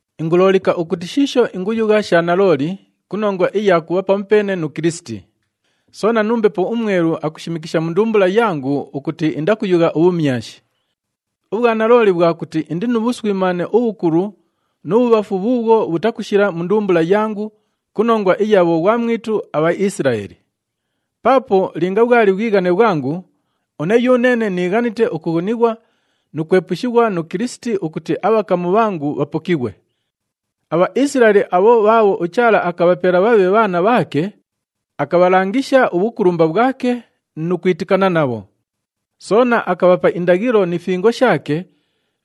Inguloolika ukuti shiisho inguyugha sha nalooli ku nongwa iya kubha pamupeene nu Kilisiti. Soona nu Mbepo uMwelu akushimikisha mu ndumbula yangu ukuti indakuyugha ubhumyashi. Ubhwanalooli bhwa kuti indi nu bhuswimaane ubhukulu nu bhubhafu bhuubhwo bhutakushila mu ndumbula yangu ku nongwa iya bhoghwamwitu aBhaisilaeli. Paapo linga bhwali bhwighane bhwangu, une yuneene niighanite ukughunighwa nu kwepushighwa nu Kilisiti ukuti abhakamu bhangu bhapokighwe. ABhaisilaeli abho bhaabho uChaala akabhapela bhabhe bhaana bhaake, akabhalangisha ubhukulumba bhwake nu kwitikana nabho. Soona akabhapa indaghilo ni fingo shaake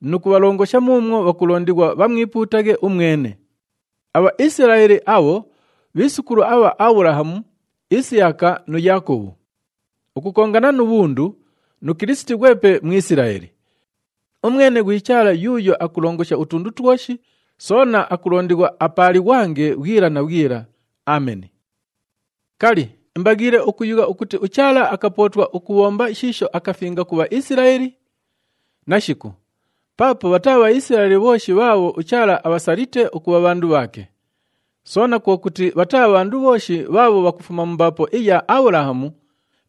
nu kubhalongosha muumwo bhakulondighwa bhamwipuutaghe umwene. ABhaisilaeli abho bhiisukulu abha Abhulahamu, Isiyaka nu Yaakobhu. Ukukongana nu bhundu, nu Kilisiti ghwepe Mwisilaeli. Umwene ghwi Chaala yuuyo akulongosha utundu twoshi, soona akulondighwa apaalighwange bhwila na bhwila! Ameni. Kali, imbaghiile ukuyugha ukuti uChaala akapootwa ukubhomba shiisho akafinga ku Bhaisilaeli? Nashiku! Paapo bhataa Bhaisilaeli bhooshi bhaabho uChaala abhasalite ukubha bhandu bhaake. Soona kwo kuti bhataa bhandu bhooshi bhaabho bhakufuma mu mbaapo iya Abhulahamu,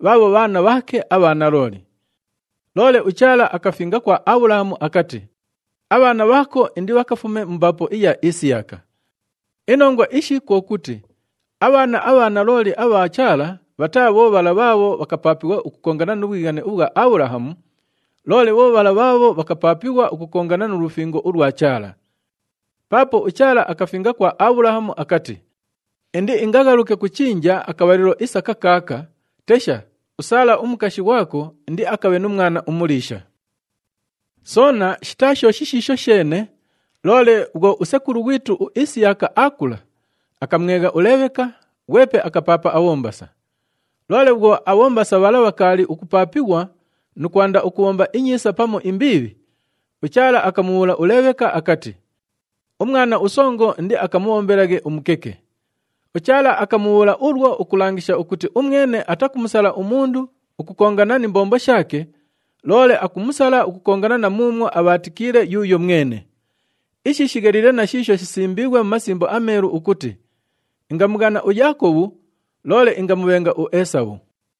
bhaabho bhaana bhaake abha nalooli. Loole uChaala akafinga kwa Abhulahamu akati, “Abhaana bhaako indibhakafume mu mbaapo iya Isiyaka.” Inongwa ishi kwo kuti abhaana abha nalooli abha Chaala bhataa bho bhala bhaabho bhakapaapighwa ukukongana nu bhwighane ubhwa Abhulahamu, loole bho bhala bhaabho bhakapaapighwa ukukongana nu lufingo ulwa Chaala. Paapo uChaala akafinga kwa Abhulahamu akati, “Indiingaghaluke ku chinja akabhalilo isa kakaaka, tesha, uSaala umukashi ghwako indiakabhe nu mwana umuliisha.” Soona shitaa sho shishiisho sheene, loole bhwo usekulu ghwitu uIsiyaka aakula, akamwegha uLeebheka, ghwepe akapaapa abhombasa. Loole bhwo abhombasa bhala bhakaali ukupaapighwa nu kwanda ukubhomba inyiisa pamu imbiibhi, uChaala akamubhuula uLeebheka akati, “Umwana usongo indiakamubhombelaghe umukeke.” UChaala akamubhuula ulwo ukulangisha ukuti umwene atakumusala umundu ukukongana ni mbombo shaake, loole akumusala ukukongana na muumwo abhaatikiile yuuyo mwene. Ishi shigheliile na shiisho shisimbiighwe mu Masimbo aMeelu ukuti, “Ingamughana uYaakobhu, loole ingamubhenga uEesabhu.”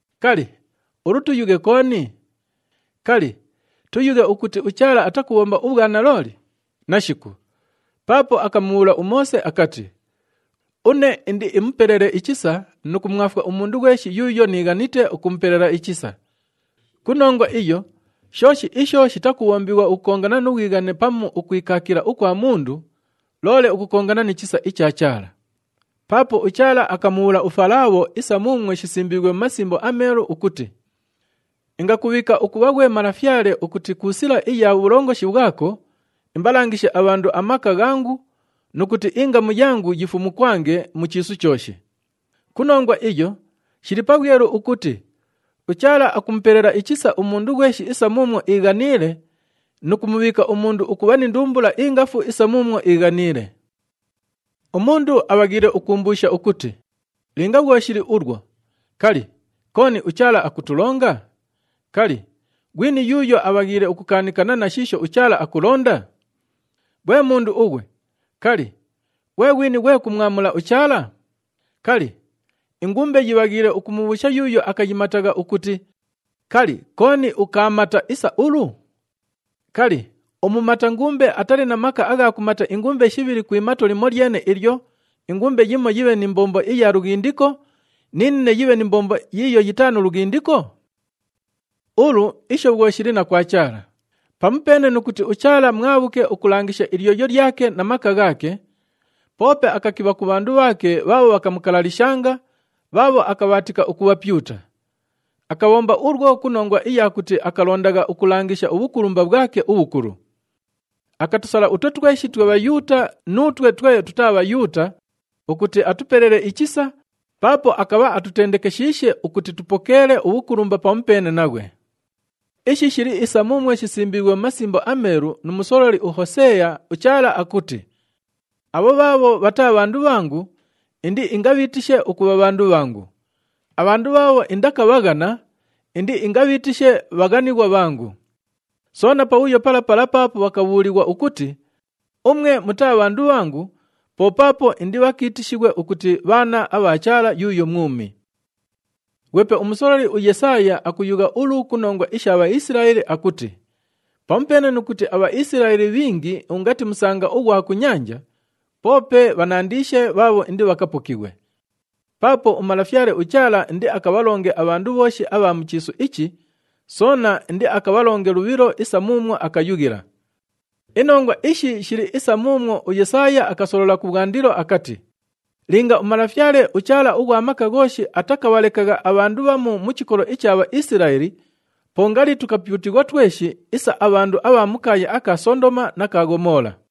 Kali, ulu tuyughe kooni? Kali, tuyughe ukuti uChaala atakubhomba ubhwanalooli? Nashiku! Paapo akamubhuula uMoose akati, “Une indiimupelele ichisa nu kumwafwa umundu ghweshi yuuyo niighanite ukumupelela ichisa.” Ku nongwa iyo, shooshi isho shitakubhombighwa ukukongana nu bhwighane pamu ukwikaakila ukwa mundu, loole ukukongana ni chisa icha Chaala. Paapo uChaala akamubhuula uFalaabho isa muumwo shisimbiighwe mu Masimbo aMeelu ukuti, “Ingakubhiika ukubha ghwe malafyale ukuti ku sila iya bhulongoshi bhwako, imbalangishe abhandu amaka ghangu nu kuti ingamu yangu yifumukwange mu chiisu chooshi.” Ku nongwa iyo, shili pabhwelu ukuti uChaala akumupelela ichisa umundu ghweshi isa muumwo iighaniile, nu kumubhiika umundu ukubha ni ndumbula ingafu isa muumwo iighaniile. Umundu abhaghiile ukuumbuusha ukuti, “Linga bhwo shili ulwo, kali, kooni uChaala akutulonga? Kali, ghwini yuuyo abhaghiile ukukaanikana na shiisho uChaala akulonda?” Ghwe mundu ughwe, kali, ghwe ghwini ghwe kumwamula uChaala? Kali, ingumbe yibhaghiile ukumubhuusha yuuyo akayimatagha ukuti, “Kali, kooni ukaamata isa ulu?” Kali, umumata ngumbe atali na maka agha kumata ingumbe shibhili ku imato limolyene ilyo, ingumbe yimo yibhe ni mbombo iya lughindiko, ni nine yibhe ni mbombo yiiyo yitaa ya lughindiko? Ulu, isho bhwo shili na kwa Chaala. Pamupeene nu kuti uChaala mwabhuke ukulangisha ilyoyo lyake na maka ghaake, poope akakibha ku bhandu bhaake bhaabho bhakamukalalishanga, bhaabho akabhaatika ukubhapyuta. Akabhomba ulwo ku nongwa iya kuti akalondagha ukulangisha ubhukulumba bhwake ubhukulu. Akatusala utwe tweshi twe Bhayuuta nuutwe twe tutaa Bhayuuta ukuti atupelele ichisa, paapo akabha atutendekeshiishe ukuti tupokeele ubhukulumba pamupeene naghwe. Ishi shili isa muumwo shisimbiighwe mu Masimbo aMeelu nu musololi uHoseeya, uChaala akuti, “Abho bhaabho bhataa bhandu bhangu, indiingabhiitishe ukubha, ‘Bhandu bhangu.’ Abhandu bhaabho indakabhaghana, indiingabhiitishe, ‘Bhaghanighwa bhangu.’” Soona, “Pabhuyo pala pala paapo bhakabhuulighwa ukuti, ‘Umwe mutaa bhandu bhangu,’ po paapo indibhakiitishighwe ukuti, ‘Bhaana abha Chaala yuuyo mwumi.’” Ghwepe umusololi uYesaaya akuyugha ulu ku nongwa isha Bhaisilaeli akuti, “Pamupeene nu kuti aBhaisilaeli bhingi ungati musanga ughwa ku nyanja, poope bhanandiishe bhaabho indibhakapokighwe. Paapo uMalafyale uChaala indiakabhalonge abhandu bhooshi abha mu chiisu ichi, soona indiakabhalonge lubhilo isa muumwo akayughila.” Inongwa ishi shili isa muumwo uYesaaya akasolola kubhwandilo akati, “Linga uMalafyale uChaala ughwa Maka Ghooshi atakabhalekagha abhandu bhamu mu chikolo icha Bhaisilaeli, po ngali tukapyutighwa tweshi isa abhandu abha mu kaaya aka Sondoma na ka Ghomoola.”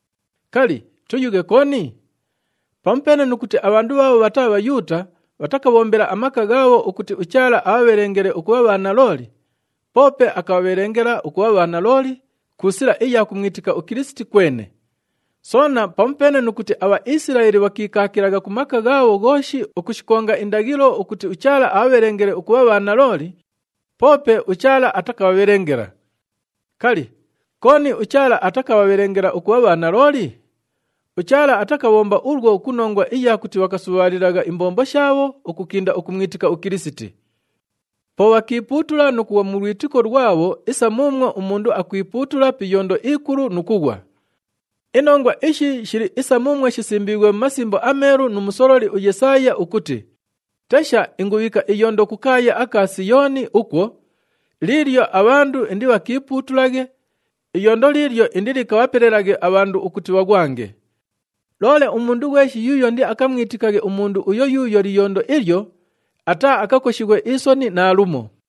Kali, tuyughe kooni? Pamupeene nu kuti abhandu bhaabho bhataa Bhayuuta bhatakabhombela amaka ghaabho ukuti uChaala abhabhelengele ukubha bhanalooli, poope akabhabhelengela ukubha bhanalooli ku sila iya kumwitika uKilisiti kwene. Soona, pamupeene nu kuti aBhaisilaeli bhakiikaakilagha ku maka ghaabho ghooshi ukushikonga indaghilo ukuti uChaala abhabhelengele ukubha bhanalooli, poope uChaala atakabhabhelengela. Kali, kooni uChaala atakabhabhelengela ukubha bhanalooli? UChaala atakabhomba ulwo ku nongwa iya kuti bhakasubhaalilagha imbombo shaabho ukukinda ukumwitika uKilisiti. Po bhakiipuutula nu kughwa mu lwitiko lwabho isa muumwo umundu akwipuutula pi iyondo ikulu nu kughwa. Inongwa ishi shili isa muumwo shisimbiighwe mu Masimbo aMeelu nu musololi uYesaaya ukuti, “Tesha, ingubhiika iyondo ku kaaya aka Siyooni ukwo, liilyo abhandu indibhakiipuutulaghe, iyondo liilyo indilikabhapelelaghe abhandu ukuti bhaghwange. Loole umundu ghweshi yuuyo indiakamwitikaghe umundu uyo yuuyo liyondo ilyo, ataaakakoshighwe isoni naalumo.”